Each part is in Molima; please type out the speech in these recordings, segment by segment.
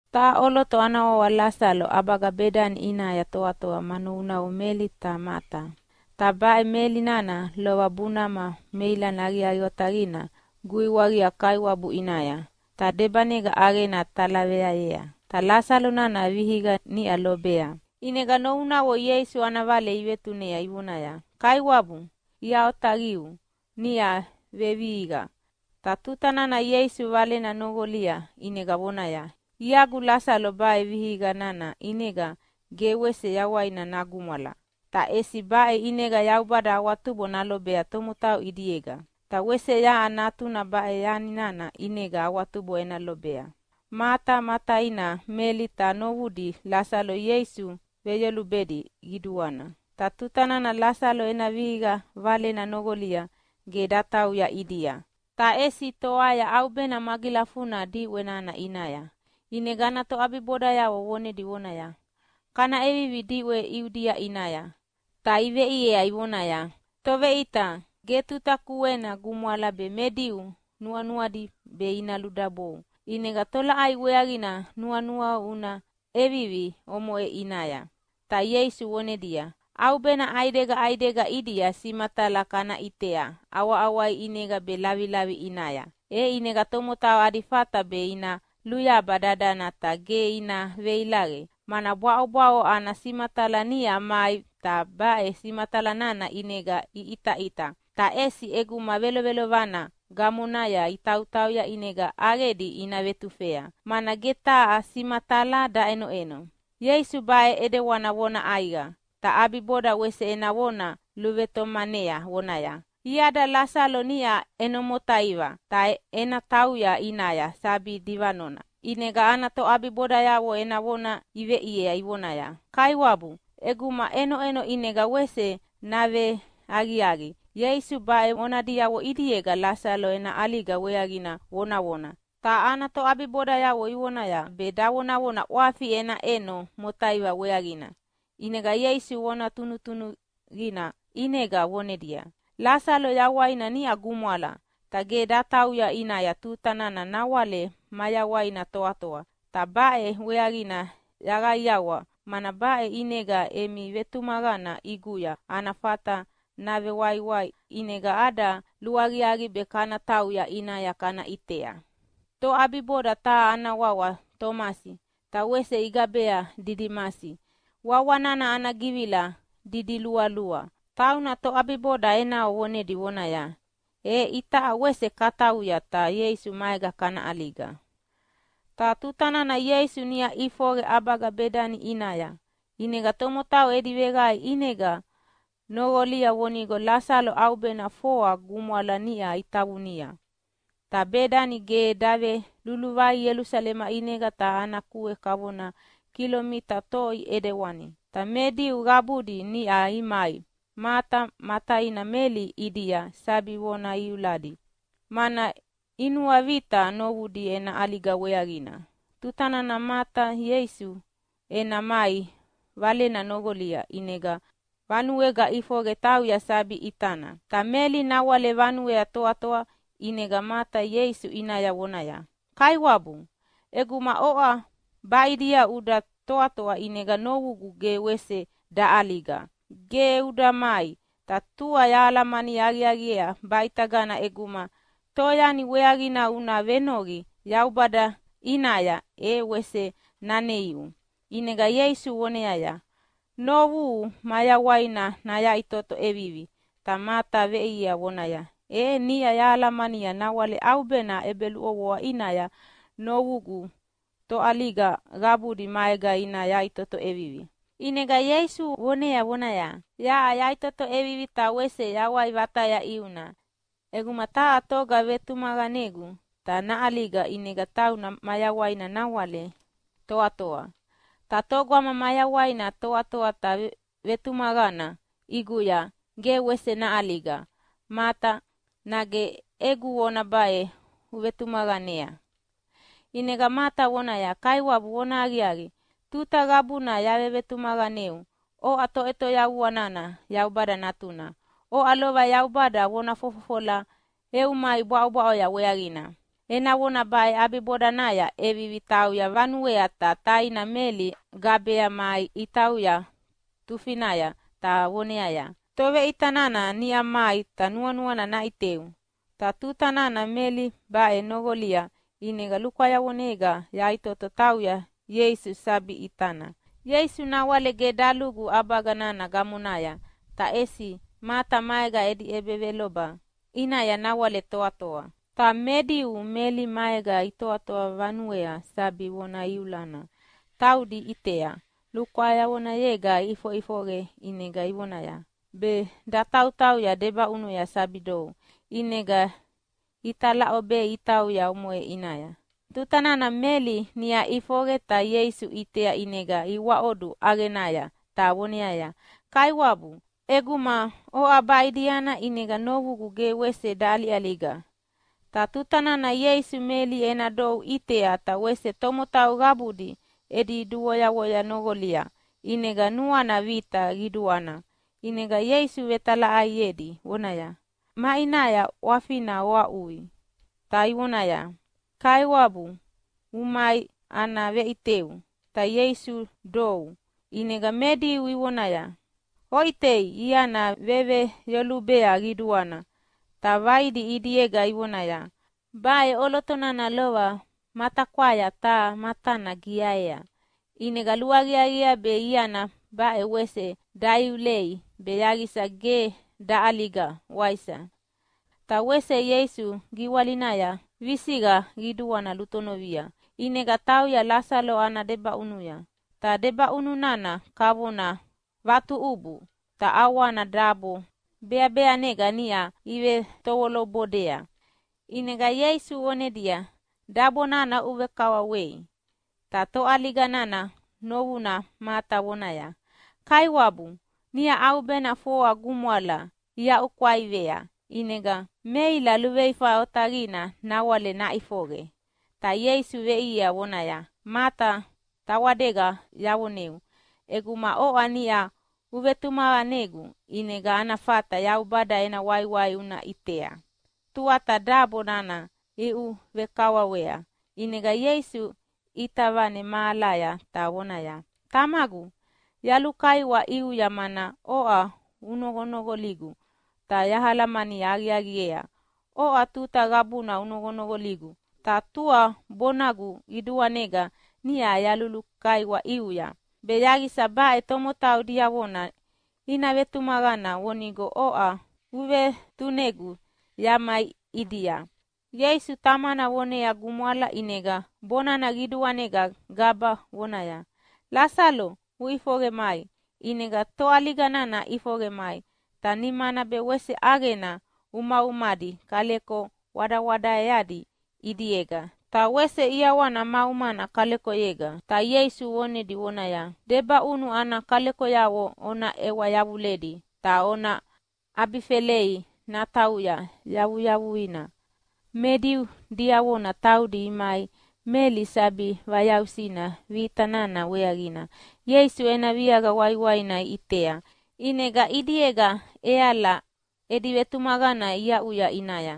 Taha ʼoloto ana wawa Lasalo ʼabaga Bedani ʼinaya toatoa ma novunavo Meli ta Mata. Ta baʼe Meli nana lova bunama meilana aqiaqi otaqina guiwaqia Kaiwabu ʼinaya, ta debanega ʼaqena talaveayea. Ta Lasalo nana vihiqa niʼa lobea. ʼInega novunavo Ieisu ana vale ivetunea ivonaya, “Kaiwabu, ia otaqiu niʼa vevihiqa.” Ta tuta nana Ieisu valena noqolia ʼinega vonaya, “Iagu Lasalo baʼe vihiqi nana ʼinega ge wese yawaina nagumwala. Ta ʼesi baʼe ʼinega Yaubada awatubo nalobea tomotau ʼidiega, ta wese yaʼa Natuna baʼe yani nana ʼinega awatubo ena lobea.” Mata ma taina Meli ta novudi Lasalo Ieisu veyolubedi qiduana. Ta tuta nana Lasalo ena vihiqa valena noqolia ge datauya ʼidia, ta ʼesi toaya ʼaubena magilafuna diʼwe nana ʼinaya. ʼInega ana toʼabibodayavo vonedi vonaya, “Kana ʼevivi diʼwe Iudia ʼinaya!” Ta iveʼiea ivonaya, “Toveʼita, ge tuta kuena gumwala me Diu nuanuadi be ina ludabou, ʼinega tolaʼai weaqina nuanuau una ʼevivi omoʼe ʼinaya?” Ta Ieisu vonedia, “ʼAubena ʼaidega ʼaidega ʼidia simatala kana ʼitea ʼawaʼawai ʼinega be lavilavi ʼinaya, e ʼinega tomotau adi fata be ina luyaba dadana ta ge ina veilaqe, mana bwaʼobwaʼo ana simatala niʼa mai ta baʼe simatala nana ʼinega iʼitaʼita. Ta ʼesi ʼeguma velovelovana gamonaya itautauya ʼinega ʼaqedi ina vetufea, mana ge taha simatala daʼenoʼeno.” Ieisu baʼe ʼidewani vona ʼaiqa, ta ʼabiboda wese ena vona luvetomanea vonaya, “Iada Lasalo niʼa ʼeno motaiva, ta ena tauya ʼinaya sabi divanona.” ʼInega ana toʼabibodayavo ena vona iveʼiea ivonaya, “Kaiwabu, ʼeguma ʼenoʼeno ʼinega wese naveaqiaqi.” Ieisu baʼe vona diavona ʼidiega Lasalo ena ʼaliga weaqina vonavona, ta ana toʼabibodayavo ivonaya be davonavona ʼwafi ena ʼeno motaiva weaqina. ʼInega Ieisu vona tunutunuqina ʼinega vonedia, “Lasalo yawaina niʼa gumwala. Ta ge eda tauya ʼinaya tuta nana nawale mayawaina toatoa, ta baʼe weaqina yaqaiqaiawa, mana baʼe ʼinega emi vetumaqana ʼiguya ana fata navewaiwai. ʼInega ada luaqiaqi be kana tauya ʼinaya kana ʼitea.” Toʼabiboda taha ana wawa Tomasi, ta wese igabea Didimasi (wawa nana ana givila didilualua), tauna toʼabiboda enavo vonedi vonaya, “E itaʼa wese katauya, ta Ieisu maega kana ʼaliga!” Ta tuta nana Ieisu niʼa ʼifoqe ʼabaga Bedani ʼinaya, ʼinega tomotau edi veqae ʼinega noqolia vonigo Lasalo ʼaubena foa gumwala niʼa itavunia. Ta Bedani ge daveluluvai Ielusalema ʼinega ta ana kue kavona kilomita toi ʼidewani, ta me Diu qabudi niʼa imai Mata ma taina Meli ʼidia sabi vona iuladi, mana inuavita novudi ena ʼaliga weaqina. Tuta nana Mata Ieisu ena mai valena noqolia ʼinega vanuega ʼifoqe tauya sabi ʼitana, ta Meli nawale vanuea toatoa. ʼInega Mata Ieisu ʼinaya vonaya, “Kaiwabu, ʼeguma oʼa baʼidia uda toatoa, ʼinega novugu ge wese daʼaliga. Ge uda mai, ta tua yahalamani aqiaqiea baʼitagana ʼeguma toyani weaqina una venoqi Yaubada ʼinaya e wese naneiu.” ʼInega Ieisu voneaya, “Novuhu mayawaina nayaʼitoto ʼevivi.” Ta Mata veʼiea vonaya, “E niʼa yahalamania nawale ʼaubena ʼebeluʼovoa ʼinaya novugu toʼaliga qabudi maega ina yaʼitoto ʼevivi.” ʼInega Ieisu vonea vonaya, “Yaʼa yaʼitoto ʼevivi ta wese yawai vataya ʼiuna. ʼEguma taha toga vevetumaqanegu ta naʼaliga, ʼinega tauna mayawaina nawale toatoa. Ta togama mayawaina toatoa ta vevetumaqana ʼiguya ge wese naʼaliga. Mata, nage egu vona baʼe uvetumaqanea?” ʼInega Mata vonaya, “Kaiwabu, vonahaqiaqi, tuta qabuna yavevetumaqaneu oʼa Toʼetoyavua nana Yaubada Natuna. Oʼa lova Yaubada vona fofofola eu mai bwaʼobwaʼoya weaqina.” Ena vona baʼe ʼabibodanaya ʼevivi tauya vanuea ta taina Meli gabea mai itauya tufinaya ta voneaya, “Toveʼita nana niʼa mai ta nuanuana naʼiteu.” Ta tuta nana Meli baʼe noqolia ʼinega lukwayavonega yaʼitoto tauya Ieisu sabi ʼitana. Ieisu nawale ge dalugu ʼabaga nana gamonaya ta ʼesi Mata maega edi ʼebeveloba ʼinaya nawale toatoa. Ta me Diu Meli maega itoatoa vanuea sabi vona iulana taudi iʼitea lukwayavonega ʼifoʼifoqe ʼinega ivonaya be datautauya debaʼunuya sabi dou. ʼInega italaʼobea itauya omoʼe ʼinaya. Tuta nana Meli niʼa ʼifoqe ta Ieisu ʼitea ʼinega iwaʼodu ʼaqenaya ta voneaya, “Kaiwabu, ʼeguma oʼa baʼidiana ʼinega novugu ge wese daʼaliʼaliga.” Ta tuta nana Ieisu Meli ena dou ʼitea ta wese tomotau qabudi edi duvoyavoya noqolia ʼinega nuana vita qiduana. ʼInega Ieisu vetalaʼaiedi vonaya, “Maʼinaya ʼwafina oaʼuya?” Ta ivoneaya, “Kaiwabu umai, ana veʼiteu.” Ta Ieisu dou. ʼInega me Diu ivonaya, “Oʼitei, iana veveyolubea qiduana!” Ta vaidi ʼidiega ivonaya, “Baʼe ʼoloto nana lova matakwaya taha matana giaea, ʼinega luaqiaqiea be iana baʼe wese daiulei be yaqisa ge daʼaliga, waisa?” Ta wese Ieisu giwalinaya visiqa qiduana lutonovia, ʼinega tauya Lasalo ana debaʼunuya. Ta debaʼunu nana kavona vatuʼubu, ta ʼawana dabo beabeanega niʼa ivetovolo bodea. ʼInega Ieisu vonedia, “Dabo nana oʼuvekawawei!” Ta toʼaliga nana novuna Mata vonaya, “Kaiwabu, niʼa ʼaubena foa gumwala iaʼukwaivea, ʼinega meila luveifa otaqina nawale naʼifoqe.” Ta Ieisu veʼiea vonaya, “Mata, tawadega yavoneu ʼeguma oʼa niʼa uvetumaqanegu ʼinega ana fata Yaubada ena waiwai una ʼitea.” Tuata dabo nana iʼuvekawawea. ʼInega Ieisu ʼita vane mahalaya ta vonaya, “Tamagu, yalulukaiwa ʼiuya mana oʼa unoqonoqoligu. Ta yahalamani aqiaqiea oʼa tuta qabuna unoqonoqoligu, ta tua bonagu qiduanega niʼa yalukaiwa ʼiuya, be yaqisa baʼe tomotau diavona ina vetumaqana vonigo oʼa uvetunegu yamai ʼidia.” Ieisu Tamana vonea gumwala, ʼinega bonana qiduanega gaba vonaya, “Lasalo, uʼifoqe mai!” ʼInega toʼaliga nana ʼifoqe mai, ta nimana be wese ʼaqena umaumadi kaleko wadawadaeadi ʼidiega. Ta wese ʼiawana ma umana kalekoyega. Ta Ieisu vonedi vonaya, “Debaʼunu ana kalekoyavo ona ʼewa yavuledi ta ona ʼabifelei natauya yavuyavuina.” Me Diu diavona taudi imai Meli sabi vayausina vita nana weaqina Ieisu ena viaqa waiwaina iʼitea, ʼinega ʼidiega ʼeala edi vetumaqana iaʼuya ʼinaya.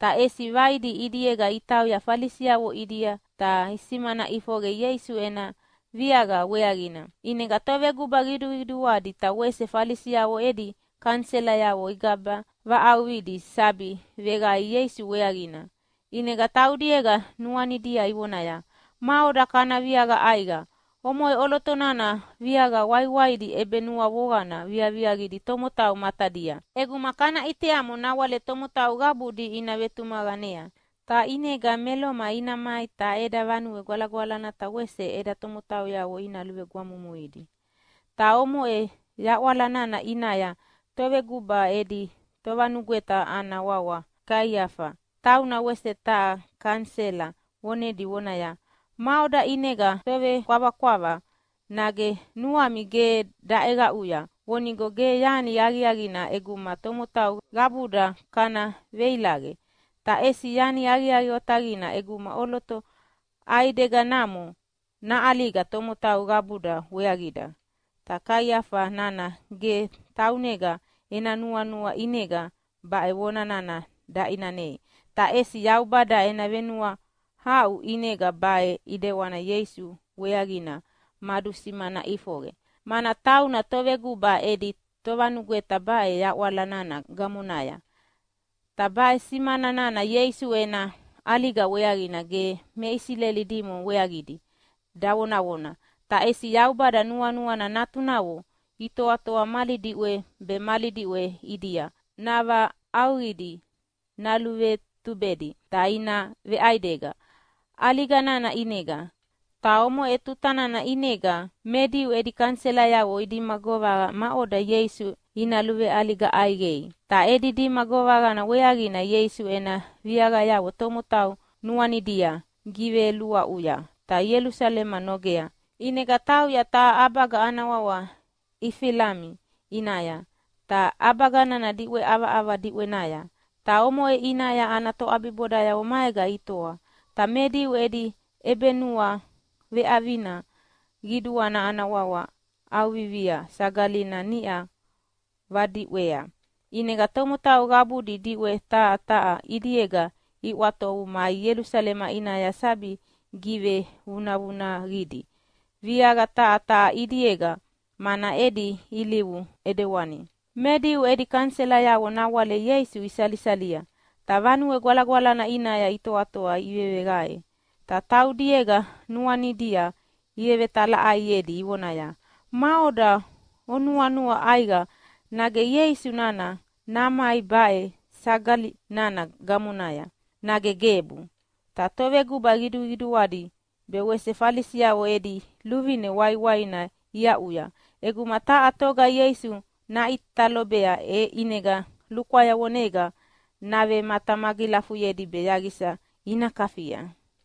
Ta ʼesi vaidi ʼidiega itauya Falisiavo ʼidia ta isimana ʼifoqe Ieisu ena viaqa weaqina. ʼInega toveguba qiduqiduadi ta wese Falisiavo edi kaniselayavo igaba vaʼauqidi sabi veqae Ieisu weaqina. ʼInega taudiega nuanidia ivonaya, “Maʼoda kana viaqa ʼaiqa? Omoʼe ʼoloto nana viaqa waiwaidi ʼebenuavoqana viaviaqidi tomotau matadia. ʼEguma kana ʼiteamo nawale tomotau qabudi ina vetumaqanea, ta ʼinega me Loma ina mai ta eda Vanue Gwalagwalana ta wese eda tomotauyavo ina luvegwamumuidi.” Ta omoʼe yaʼwala nana ʼinaya toveguba edi tovanugweta ana wawa Kaiafa tauna wese taha kanisela vonedi vonaya, “Maʼoda ʼinega ovevekwavakwava? Nage nuami ge daʼeqaʼui vonigo ge yani aqiaqina ʼeguma tomotau qabuda kana veilaqe, ta ʼesi yani aqiaqi otaqina ʼeguma ʼoloto ʼaideganamo naʼaliga tomotau qabuda weaqida.” Ta Kaiafa nana ge taunega ena nuanua ʼinega baʼe vona nana daʼinanei, ta ʼesi Yaubada ena venuahaʼu ʼinega baʼe ʼidewani Ieisu weaqina madusimana ʼifoqe, mana tauna toveguba edi tovanugweta baʼe yaʼwala nana gamonaya. Ta baʼe simana nana Ieisu ena ʼaliga weaqina ge me Isileli dimo weaqidi davonavona, ta ʼesi Yaubada nuanuana natunavo itoatoa mali diʼwe be mali diʼwe ʼidia navaʼauqidi naluvetubedi ta ina veʼaidega ʼaliga nana ʼinega. Ta omoʼe tuta nana ʼinega me Diu edi kaniselayavo idima govaqa maʼoda Ieisu ina luveʼaliga ʼaiqei. Ta edi dima govaqa weaqina Ieisu ena viaqayavo tomotau nuanidia giveluaʼuya ta Ielusalema nogea. ʼInega tauya taha ʼabaga ana wawa Efilami ʼinaya, ta ʼabaga nana diʼwe ʼavaʼava diʼwenaya. Ta omoʼe ʼinaya ana toʼabibodayavo maega itoa. Me Diu edi ʼebenuaveʼavina qiduana ana wawa ʼAuvivia Sagalina niʼa vadiʼwea, ʼinega tomotau qabudi diʼwe taha taha ʼidiega iʼwatovu imai Ielusalema ʼinaya sabi givevunavunaqidi viaqa taha taha ʼidiega, mana edi ilivu ʼidewani. Me Diu edi kaniselayavo nawale Ieisu isalisalia. Ta Vanue Gwalagwalana ʼinaya itoatoa iveveqae, ta taudiega nuanidia ivetalaʼaiedi ivonaya, “Maʼoda onuanua ʼaiqa, nage Ieisu nana namai baʼe sagali nana gamonaya, nage gebu?” Ta toveguba qiduqiduadi be wese Falisiavo edi luvine waiwaina iaʼuya ʼeguma taha toga Ieisu naʼita lobea, e ʼinega lukwayavonega navematamagilafuyedi be yaqisa ina kafia.